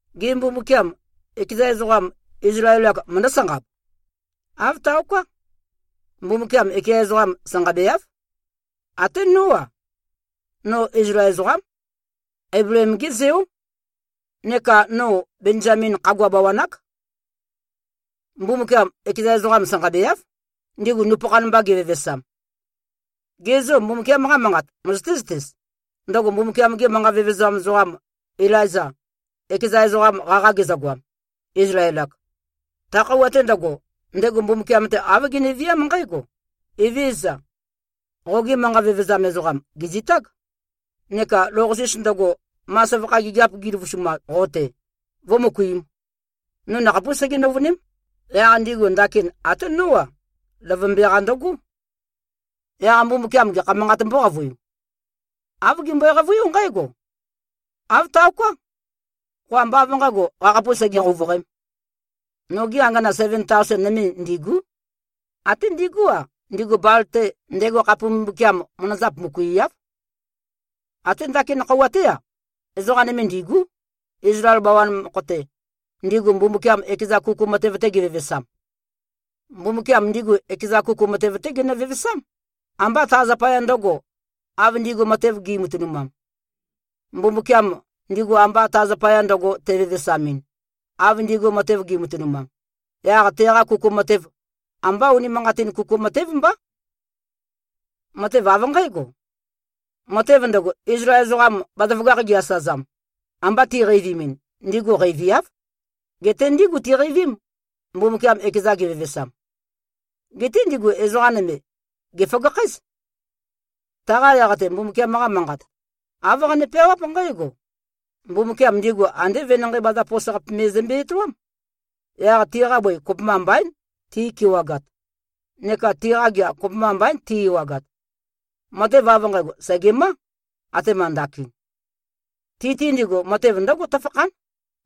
Gê, Mbumbukiam, ekeza ezoqam, Izlael-ak, møndǿ-sanqab? Āv taoká. Mbumbukiam ekeza ezoqam sanqabeáv. Até nó-a. No Izlael ezoqám, Eibleem-gé zeó, neka no Benzamin khagua bawan-ák. Mbumbukiam ekeza ezoqam sanqabeáv, ndigu nupøkhan mba gevevesam. Gê, zo Mbumbukiam-qa Manqat møzøté-zøtez, ndøgo Mbumbukiam-ge manqa vevezam ezoqam Ilaiza, ekeza ezoqam qaqa gezøgoam, Izlael-ak? Ta khøuwa-te ndøgo, ndego Mbumbukiam-te āv geneviám nqǽgo, “Evézøza! Qogi manqa vevezam ezoqam, gèzitág, neka lou-qasis ndøgo, ma søvakha gigiap giløvusumam qo-te, vø̄møkuim. No nakhapús sege-nøuvøném. Yaq ndigu ndakin até nó-a, løvømbe-qa ndøgó.” Yaq Mbumbukiam gekha manqāt mbóqavøiu? Āv gembøe-qavøiú nqǽgo, “Āv taoká. Qo ambá av nqǣgo, qakhapus sege-qouvøqēm. Nogi angana seven taosen nøme ndîgú. Até ndigú-a, ndigu Bal-te, ndego khape mbumbukiam, manazap møkuiáv.” Até ndakin khøuwa-té-a, ezoqa nøme ndîgú, Izlael bawan mokho-te, ndigu Mbumbukiam ekeza kuku matev-te gevevesam. Mbumbukiam ndigu ekeza kuku matev-té genø-vevesám, ambá ta zapaya ndø̄go, av ndigu matev gi꞉matønumam. Mbumbukiam, ndigu amba ta zapaya ndøgo tevevesamɨn, av ndigu matev gi꞉matønumam, yaq teqa kuku matev, ambá unimanqatin kuku matév mbá. Matev av nqǽgo: Matev ndøgo, Izlael ezoqam bazaføgakh gi-asøzam, amba tiqeivimin, ndigu qeiviáv. Geté ndígu tiqeivím, Mbumbukiam ekeza gevevesam. Geté ndigu ezoqa nøme, gèføgakhǽz. Taqa yaq-te Mbumbukiam-qa Manqat, āv qane-peawáp nqǽgo, “Mbumbukiam ndigu andé venanqei bazapos-qape me zømbe-etoám. Yaq tiqa bøi kopømba mbaín ti꞉kewagat neka tiqa gea kopømba mbaín ti꞉-ewagat. Matev av nqægo sègemá, atema ndakin.” Ti-te ndigu, matev ndǿgo tøfakhán,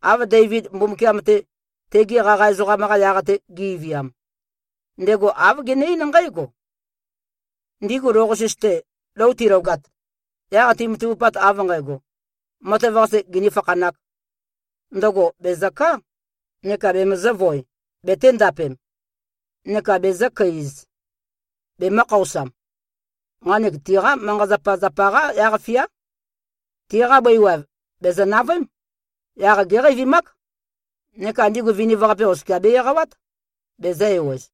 av Deivid Mbumbukiam-te, tegi qaqa ezoqam-qa yaq-te ge꞉viam. Ndego āv gene-eín nqǽgo, “Ndigu lou-qasis-te, lou tilogat, yaq timatavupat av nqægo, matev-qase ginī-fakhanāk, ndøgo bèzø-ká neka bemøzø̄-voe, betēndapem, neka bezø̄-køi-ez, bemø̄-khaosam. Nqanek tiqá manqa-zapazapa-qá yaq-fiá. Tiqa bøi waev, bèzø-navøém. Yaq géqeivimák. Neka ndigu viniv-qape oskia be-eqawát, bezø̄-ewez.”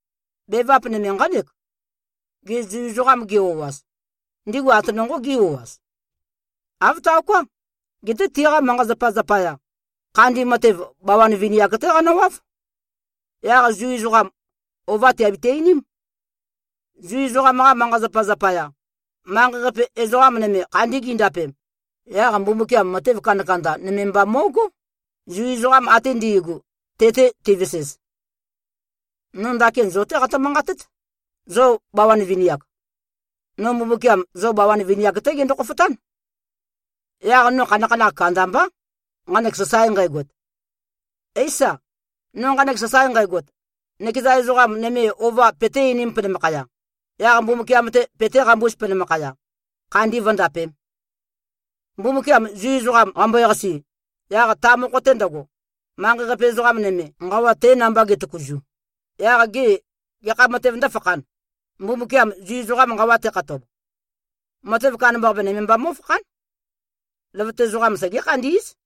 Bevap nøme nqánek: Gê, Zu ezoqam gi-o꞉az, ndigu ate nonqō gí-o꞉az? Āv taoká! Geté tiqa manqa-zapa zapaya, khandi matev, bawan vini-ak-té qanøwáv. Yaq Zu ezoqam, ova tìabiti-einím. Zu ezoqam-qa manqa-zapazapa zapaya, manqei-qape ezoqa nøme khandi gindapem, yaq Mbumbukiam matev kandakanda nøme mba mó꞉gó, Zu ezoqam ate ndi꞉gu, te-te tivesez. No ndakin zo-té qatø-manqatét, zo bawan vini-ak. No Mbumbukiam zo bawan vini-ak-té gendo-khofotán. Yaq no khanakhanakh kandambá, nqanek sasae nqægot. Éisa, no nqanek sasae nqægot, nøkeza ezoqa nøme ova peté-einīm penømakhaya, yaq Mbumbukiam-te petéqambūz penømakhaya, khandi vǿndapēm. Mbumbukiam Zu ezoqam qambøe-qasi, yaq ta mokho-te ndøgo, manqei-qape ezoqa nøme, nqawa te namba getøkuzu, yaq gê, gekha matev ndǿfakhān, Mbumbukiam Zu ezoqam nqawa tekhatob? Matev kandambaqape nøme mba mó꞉fákhan. Løvøte ezoqam segé-khandí꞉z.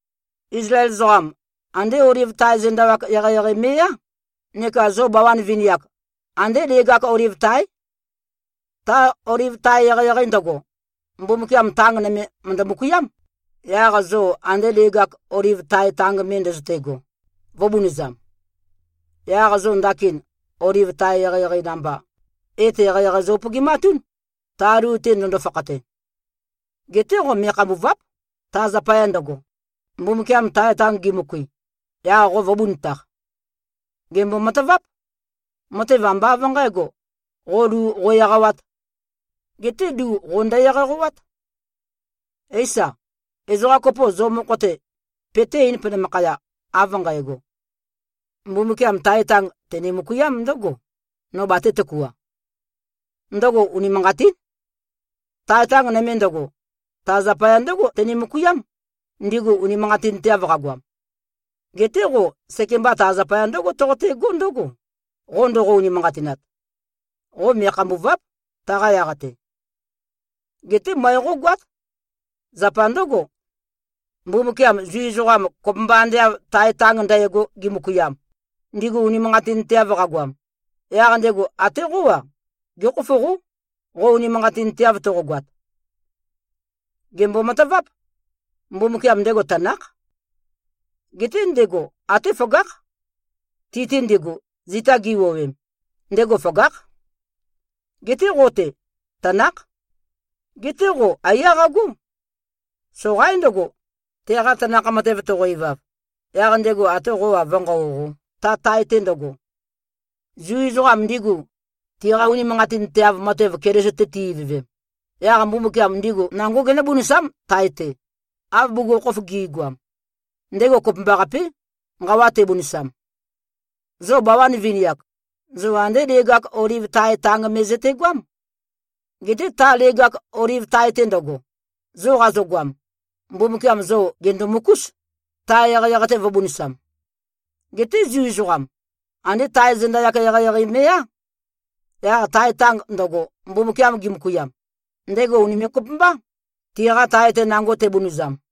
Izlael ezoqam, andé oliv tae zenda-yak eqeieqei me꞉yá, neka zo bawan vini-ak, andé leg-ak oliv táe. Ta oliv tae eqeieqei ndøgo, Mbumbukiam tang nøme mø̀ndø-møkuiám, yaq zo ande leg-ak oliv tae tang me ndøzøte꞉go, vø̄bunøzam. Yaq zo ndakin oliv tae eqeieqei namba, et eqeieqei zo-upøgimatún, ta lu-te ndøndo-fakhate. Geté qo me꞉khambùva᷄p, ta zapaya ndøgo, Mbumbukiam tae tang gimøkui, yaq qo vø̄bunøtaq. Gèmbo-mataváp. Matev, ambá av nqǣgo, qo lu qo-eqawāt. Geté lu qo ndø-eqaqæwát. Éisa, ezoqa kopo zo mokho-te peté-eīn penømakhaya, av nqægo, “Mbumbukiam tae tang tene-møkuiám ndǿgo, no batē-tøkua.” Ndøgo unimanqatín. Tae tang nøme ndøgo, ta zapaya ndǿgo tene-møkuiám, ndigu unimanqatinteav qagoam. Geté qo sekemba ta zapaya ndǿgo toqotegó ndøgo, qo ndoqo-unimanqatinat. Qo me꞉khambùva᷄p, taqa yaq-te. Geté møe qógoát. Zapa ndǿgo, Mbumbukiam Zu ezoqam kopømba ande av tae tang ndægo gimøkuiam, ndigu unimanqatinteav qagoam, yaq ndego até qó-a, gékhofoqó, qo unimanqatinteav toqogoat. Gèmbo-mataváp. Mbumbukiam ndego tanákh. Geté ndego até føgákh. Ti-te ndigu, zita giwuowem, ndego føgákh. Geté qo-te, tanákh. Geté qo aiyá qagó. Soqaín ndøgo, teqa tanakh matev toqo-ivav, yaq ndego atē qō-a, vǿnqaoqō, ta tae-te ndøgo. Zu ezoqam ndigu, tiqa unimanqatinteav matev Keliso-te ti-ivøvem, yaq Mbumbukiam ndigu nangó genǿbunøsám tae-te, av bugukhokhof gi꞉goam. Ndego kopømbaqapé, nqawa tebunøsam. Zo bawan vini-ak, zo andé leg-ak oliv tae tang me zøtegoám. Geté ta leg-ak oliv tae-te ndøgo, zo qazogoam, Mbumbukiam zo gèndomøkús, tae eqeieqei-te vø̄bunøsam. Geté Zu ezoqam, andé tae zenda-yak eqeieqei me꞉yá. Yaq tae tang ndøgo, Mbumbukiam gemøkuiam, ndego ùnime꞉-kopømbá, tiqa tae-te nango tebunøzam.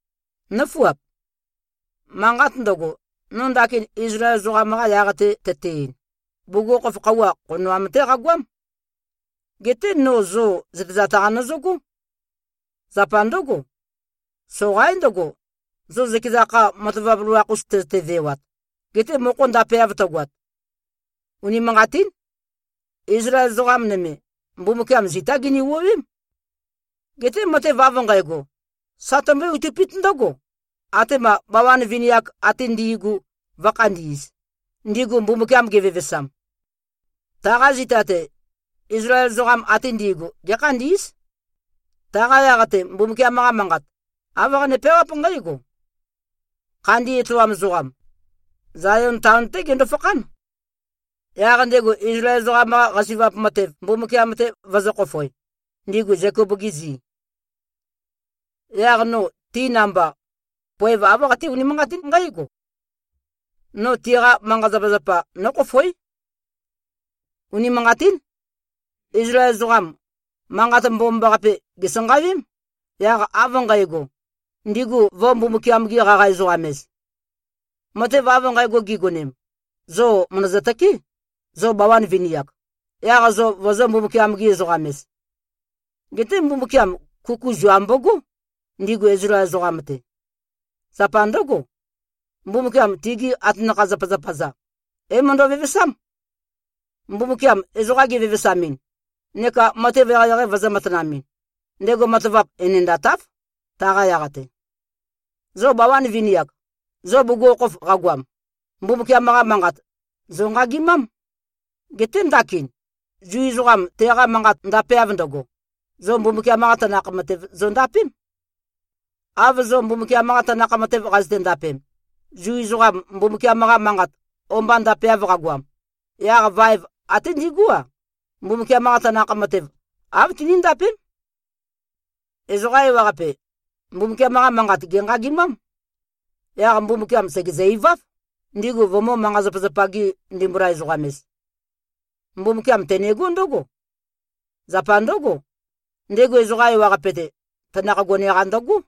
Nǿfuap. Manqat ndøgo, no ndakin Izlael ezoqam-qa yaq-te tøte-ein, bugukhokhof khøuwa, khonoam-té qagoám. Geté no zo zøtezat-qa nøzøgó. Zapa ndǿgo, soqaín ndøgo, zo zøkeza kha matavap loloakh-us tøzøte-vewat, gete mokho ndapeav tøgoat. Unimanqatín. Izlael ezoqa nøme, Mbumbukiam zitá gini-wuowém. Geté matev av nqægo, sa tømbøé-outøpít ndǿgo, atema bawan vini-ak ate ndi꞉gu vǿkhandī꞉z, ndigu Mbumbukiam gevevesam. Taqa zita-te, Izlael ezoqam ate ndi꞉gu gékhandí꞉z. Taqa yaq-te, Mbumbukiam-qa Manqat, āv qane-peawáp nqǽgo, “Khandi etoam ezoqam, Zayon taon-té gendó-fakhán, yaq ndego Izlael ezoqam-qa qasi꞉vap matev Mbumbukiam-te vøzǿ-khofoē, ndigu Zekop-gi zi. Yaq no ti namba, poev āv qaté-unimanqatín nqǽgo: No tiqa manqa-zapazapa nókhofoé.” Unimanqatín. Izlael ezoqam, Manqat Mbomambaqape gèsanqawém, yaq av nqægo, ndigu vø̄-Mbumbukiam-gi-qaqa-ezoqam-ez. Matev av nqægo gigonem, zo mø̀ndøzø-tøké, zo bawan vini-ak, yaq zo vozō-Mbumbukiam-gi-ezoqam-ez. Geté Mbumbukiam kuku zua mbogó, ndigu Izlael ezoqam-te. Zapa ndǿgo, Mbumbukiam tigi atanakha-zapazapa-za, é-møndø-vevesám. Mbumbukiam ezoqa gevevesamɨn neka matev eqeieqei vøzø̄-matanamɨn, ndego matavap enendatáv, taqa yaq-te. Zo bawan vini-ak, zo bugukhokhof qagoam, Mbumbukiam-qa Manqat, zònqagimám. Geté ndakin, Zu ezoqam teqa manqat ndapeav ndøgo, zo Mbumbukiam-qa tanakh matev zondapém. Av zo Mbumbukiam-qa tanakh matev qazøte-ndapem, Zu ezoqam Mbumbukiam-qa Manqat o-mba ndapeav qagoam, yaq vaev até ndigú-a, Mbumbukiam-qa tanakh matev, āv tiníndapém. Ezoqa ewaqape, Mbumbukiam-qa manqat gènqagimám. Yaq Mbumbukiam sègezø-iváv, ndigu vømø̄-manqa-zapazapa-gi-ndimbula-ezoqam-ez. Mbumbukiam tenegó ndǿgo: Zapa ndǿgo, ndego ezoqa ewaqape-te, tanakh gone-qa ndøgó.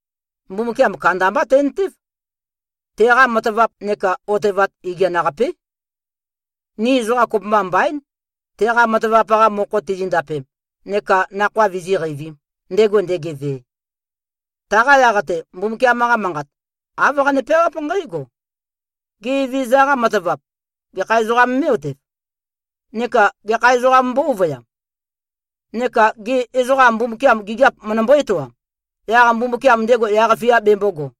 Mbumbukiam kandambá tentév. Teqa matavap neka otevat igian-qapé. Ni ezoqa kopømba mbaín, teqa matavap-qa mokho tizindapem neka nakhoa vizíqeivīm, ndego ndegeve. Taqa yaq-te, Mbumbukiam-qa Manqat, āv qane-peawáp nqǽgo, “Gê, Evezøza-qa matavap, gekha ezoqām mé꞉-otev? Neka gekha ezoqām mbó-ovøyām? Neka gê, ezoqa Mbumbukiam gigiap møndømbó-etoam, yaq Mbumbukiam ndego yaq-fia bembōgo?”